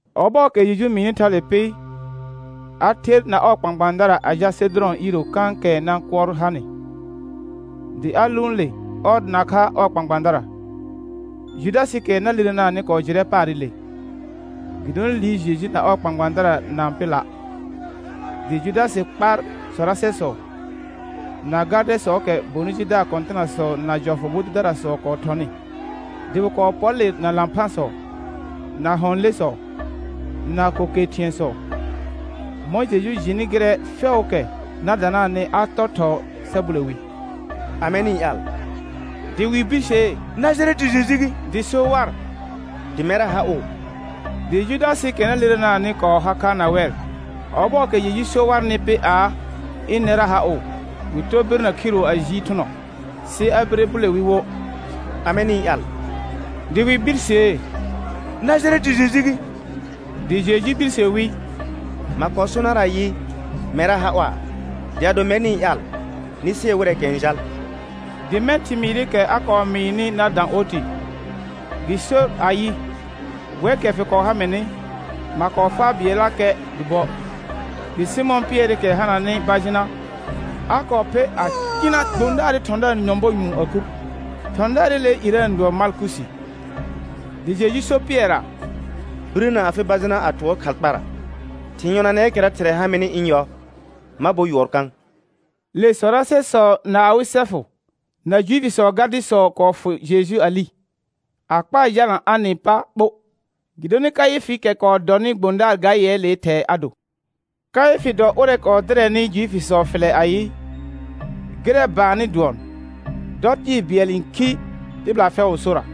Ɔbɔɔkɛ Jeju mɩɩnɩ thale pɩ, a ther na ɔɔ kpãkpãadara a jal Sedʋrɔ̃ iiro kãkɛ nãkʋɔr hanɩ, dɩ a lʋʋn le ɔr nakha ɔɔ kpãkpãadara. Judasɩɩkɛ na lirenaanɩ kɔɔ jɩrɛ paarɩle, gɩdonɩ liir Jeju na ɔɔ kpãkpãadara na-n pɩ la'. Dɩ Judasɩ kpar sɔrasɛsɔ, na gardɛsɔɔkɛ bonɩ jidaar kɔ̃tɩnasɔ na jɔfʋ bʋ dʋdarasɔ kɔɔ thɔnɩ, dɩ wɩ kɔɔ pɔr le na lãphãsɔ, na hɔ̃ lesɔ, na ko ke thɩ̃ɛsɔ. Mɔ̃ Jeju jɩnɩ gɩrɛ fɛʋʋkɛ na danaanɩ a tɔr thɔɔ sa bule wi: Amɛ nɩ-n ƴaal? Dɩ wɩ birsee: Najarɛtɩ Jeju gɩ. Dɩ so war: Dɩ mɛrra ha ʋ. Dɩ Judasɩɩkɛ na lirenaanɩ kɔɔ har kha na wɛr. Ɔbɔɔkɛ Jeju so warnɩ pɩ aa, ɩnɛrra ha ʋ, wɩ tɔr birnə khiru a jiir thʋnɔ. Sɩ a bire bule wi wo: Amɛ nɩ-n ƴaal? Dɩ wɩ birsee: Najarɛtɩ Jeju gɩ. Dɩ Jeju birse wi: Ma kɔɔ so nar ayɩ: Mɛrra ha ʋa'. Dɩ ado mɛr nɩ-n ƴaal, nɩ sɩɛr wɩrɛɛkɛ n jal. Dɩ mɛ̃ thɩmɩɩrɩkɛ a kɔɔ mɩɩnɩ na dã oti. Gɩ sor ayɩ: Wɛkɛ fɩ kɔɔ ha mɩnɩ, ma kɔɔ faa bɩɛllakɛ dɩ buə'. Dɩ Sɩmɔ̃ Pɩɛrɩkɛ hananɩ bajɩna, a kɔɔ pher a cɩna gbõdaarɩ thɔ̃daar nyɔ̃bɔ nũu a kur. Thɔ̃daarɩlee irə n dʋɔn Malkusi. Dɩ Jeju so Pɩɛrra: Birəna afɩ bajɩna a tʋɔr khal kpara. Thɩ̃ yɔnanɛɛkɛra Thɩrɛ ha mɩnɩ ɩ̃ yɔ, ma bor yʋɔr kã? Le sɔrasɛsɔ na awɩ sɛfʋ, na Juifisɔɔ gardɩsɔ kɔɔ fʋ Jeju a li, a kpaa jalna Anɩ pa ɓo, gɩdonɩ Kaɩfɩɩkɛ kɔɔ dɔnɩ gbõdaar ga yɛɛlee thɛɛ a do. Kaɩfɩ dɔ ʋrɛ kɔɔ dɩrɛnɩ Juifisɔ fɩlɛ ayɩ: Gɩrɛ baannɩ dʋɔn, dɔ tɩɩ bɩɛl n khi tɩbɩla fɛʋʋ sora.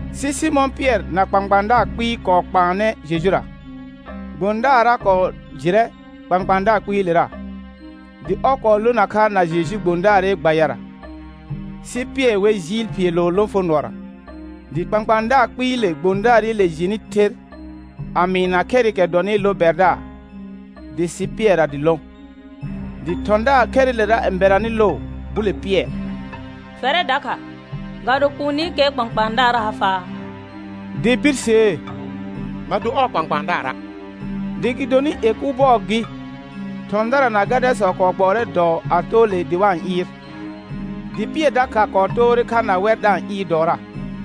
Sɩ Sɩmɔ̃ Pɩɛr na kpãkpãadaar kpɩɩ kɔɔ kpaanɛ Jejura. Gbõdaarra kɔɔ jɩrɛ kpãkpãadaar kpɩɩlera, dɩ ɔr kɔɔ lona kha na Jeju gbõdaarɩ gbayara. Sɩ Pɩɛr wer jɩɩl phiilo lõfonʋɔra. Dɩ kpãkpãadaar kpɩɩle gbõdaarɩle jɩnɩ ther a mɩɩna khɛrɩkɛ dɔnɩ lo bɛrdaar, dɩ sɩ Pɩɛrra dɩ lõ. Dɩ thɔ̃daar khɛrɩlera n bɛranɩ loo bule Pɩɛr: Fɛrɛ dakha, ga do kuunikɛɛ kpãkpãadaar ha faa? Dɩ birsee: Ma do ɔɔ kpãkpãadaara'. Dɩ gɩdonɩ ie kʋ bɔɔ gɩ, thɔ̃dara na gardɛsɔ kɔɔ gbɔɔrɛ dɔɔ a too le dɩ wa-n ɩɩr, dɩ Pɩɛr dakha kɔɔ toore kha na wɛr da-n ɩɩr dɔɔra.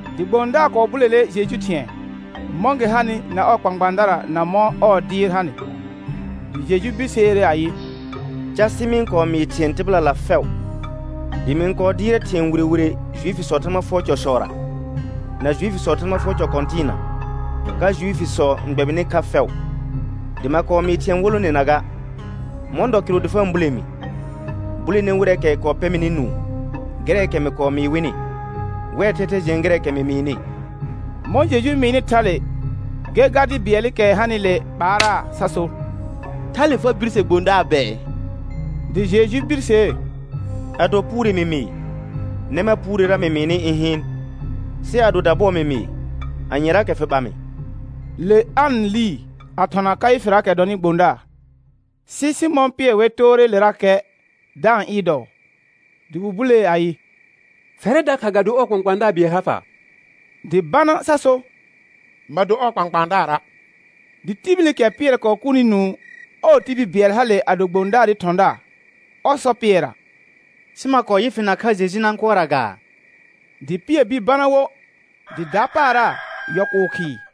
Dɩ gbõdaar kɔɔ bulele Jeju thɩ̃ɛ, mɔ̃ gɩ hanɩ na ɔɔ kpãkpãadara na mɔ̃ ɔɔ dɩɩr hanɩ. Dɩ Jeju birseere ayɩ: Casɩ mɩ-n kɔɔ mɩɩ thɩ̃ɛ tɩbɩlala fɛʋ, dɩ mɩ-n kɔɔ dɩɩrɛ thɩ̃ɛ wire wire Juifisɔɔ Thãgba fʋɔr cɔsɔra, na Juifisɔɔ Thãgba fʋɔr cɔ kɔ̃tɩɩna, ka Juifisɔ n gbɛbɩnɩ kha fɛʋ, dɩ ma kɔɔ mɩɩ thɩ̃ɛ wolonena ga. Mɔ̃ dɔ kɩrʋ dɩ fa-n bule mi? Bulene wɩrɛɛkɛ kɔɔ pɛ mɩnɩ nũu gɩrɛɛkɛ mɩ kɔɔ mɩɩ wɩnɩ. Wɛr thɛthɛ jɩɛn gɩrɛɛkɛ mɩ mɩɩnɩ. Mɔ̃ Jeju mɩɩnɩ thale, gɛr gardɩ bɩɛlɩkɛ hanɩle ɓaaraa sa so: Thale fa birse gbõdaar bɛɛ? Dɩ Jeju birsee: Ado puure mɩ mɩɩ, nɛ mar puurera mɩ mɩɩnɩ ɩ̃ hɩɩn. Sɩ ado dabʋɔ mɩ mɩɩ, anyeraakɛ fɩ ɓa mɩ? Le An lii a thɔna Kaɩfɩraakɛ dɔnɩ gbõdaar. Sɩ Sɩmɔ̃ Pɩɛr wer toore lerakɛ da-n ɩɩr dɔɔ. Dɩ wɩ bulee ayɩ: Fɛrɛ dakha, ga do ɔɔ kpãkpãadaar bɩɛl ha faa? Dɩ bana sa so: Ma do ɔɔ kpãkpãadaara'. Dɩ tibilikɛ Pɩɛr kɔɔ kurni nũu, ɔɔ tibil bɩɛl hale a do gbõdaarɩ thɔ̃daar, ɔr sɔ Pɩɛrra: Sɩ ma kɔɔ yɩ fɩ nakha Jeju nãkʋɔrra gaa? Dɩ Pɩɛr bir bana wo, dɩ dapaara yɔl kʋʋ khɩɩ.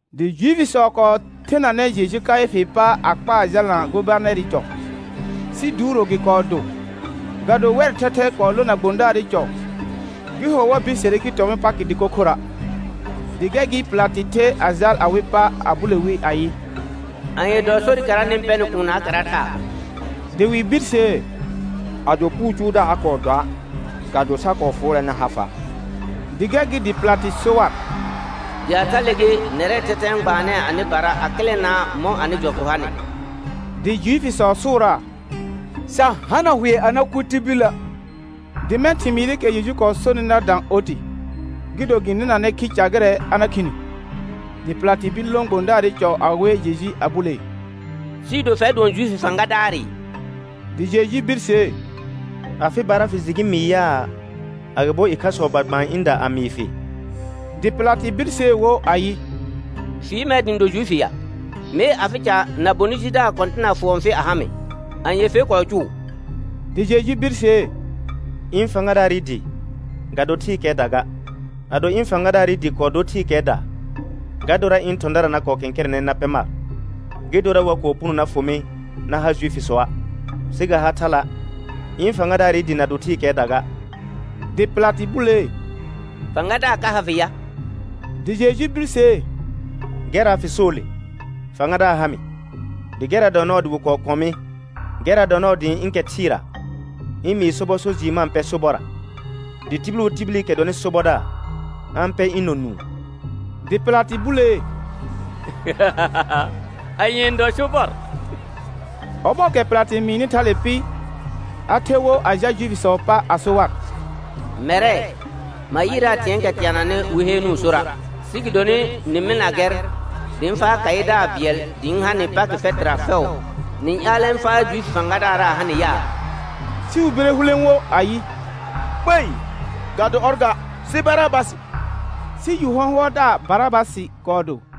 Dɩ Juifisɔ kɔɔ thenanɛ Jeju Kaɩfɩɩ pa a kpaa jalna gobanɛrɩ cɔ. Sɩ duuro gɩ kɔɔ do. Ga do wɛr thɛthɛ kɔɔ lona gobanɛrɩ cɔ, gɩ ho wa bisere gɩ tɔ̃ wɩ Pakɩ dɩko khora'. Dɩ gɛr gɩ Pɩlatɩ the a jal awɩ pa a bule wi ayɩ: Anye dɔ sorɩkɛra nɩ-n pɛnɩ kuunnaakɛra thaa? Dɩ wɩ birsee: Ado puu cʋʋdaar a kɔɔ doa' ga do sa kɔɔ fʋʋrɛ na ha fa'. Dɩ gɛr gɩ dɩ Pɩlatɩ so war: Dɩ a thale gɩ, nɛrɛɛ thɛthɛ n gbaanɛɛ anɩbara a kɩlɛnaa mɔ̃ anɩ jɔfʋ hanɩ. Dɩ Juifisɔ sʋʋraa: Sa hana hʋɛ a na kʋ tibilə'. Dɩ mɛ̃ thɩmɩɩrɩkɛ Jeju kɔɔ sonɩ na dã oti, gɩ do gɩ nɩnanɛ khi ca gɩrɛ a na khini. Dɩ Pɩlatɩ bir lõ gobanɛrɩ cɔ a we Jeju a bulee: Sɩɩ do fɛr dʋɔn Juifi fãgadaarɩ? Dɩ Jeju birsee: Afɩbara fɩ jɩ gɩ mɩɩ yaa, agɩbo ɩkhasɔ ba gbaan ɩ̃da a mɩɩ fɩ? Dɩ Pɩlatɩ birsee wo ayɩ: Fɩ yɩ mɛr dɩ ɩ̃ do Juifi ya? Mee, afɩ ca na bonɩ jidaar kɔ̃tɩna fʋɔn fɩ a ha mɩ. Anye fer kɔɔ cʋʋ? Dɩ Jeju birsee: Ɩ̃ fãgadaarɩ dɩ, ga do thɩɩkɛɛda ga. Ado ɩ̃ fãgadaarɩ dɩ kɔɔ dor thɩɩkɛɛda, ga dorra ɩ̃ thɔ̃dara na kɔɔ kɛ̃kɛrɛnɛ na pɛ mar, gɩ dora wa kɔɔ puno na fʋ mɩ na ha Juifisɔa'. Sɩ ga ha thala', ɩ̃ fãgadaarɩ dɩ na do thɩɩkɛɛda ga. Dɩ Pɩlatɩ bulee: Fãgadaar ka ha fɩ ya? Dɩ Jeju birsee: Gɛrra fɩ soo le, fãgadaar ha mɩ. Dɩ gɛrra dɔ nɔɔ dɩ wɩ kɔɔ kɔ̃ mɩ, gɛrra dɔ nɔɔ dɩ ɩ̃ ɩ̃ kɛ thɩɩra ɩ̃ mɩɩ sobɔ so jɩɩr ma-n pɛ sobɔrra. Dɩ tibil wo tibilikɛ dɔnɩ sobɔdaar, a-n pɛr ɩ̃ nɔ nũu. Dɩ Pɩlatɩ bulee: Anye n dɔ sobɔr? Ɔbɔɔkɛ Pɩlatɩ mɩɩnɩ thale pɩ, a ther wo a jal Juifisɔɔ pa a so war: Mɛrɛ, ma yɩɩraa thɩ̃ɛɛkɛ teananɩ wɩ heenuu sora'. Sɩ gɩdonɩ nɩ mɩlna gɛr dɩ ɩ̃ faa khaɩdaar bɩɛl dɩ ɩ̃ ha nɩ Pakɩ fɛtɩra fɛʋ, nɩ-n ƴaalɛ ɩ̃ faa Juifi fãgadaarra a ha nɩ yaa? Sɩ wɩ bire hulẽ wo ayɩ: Kpei, ga do ɔr ga, sɩ Barabasɩ. Sɩ yu hɔ̃hʋɔldaar Barabasɩ kɔɔ do.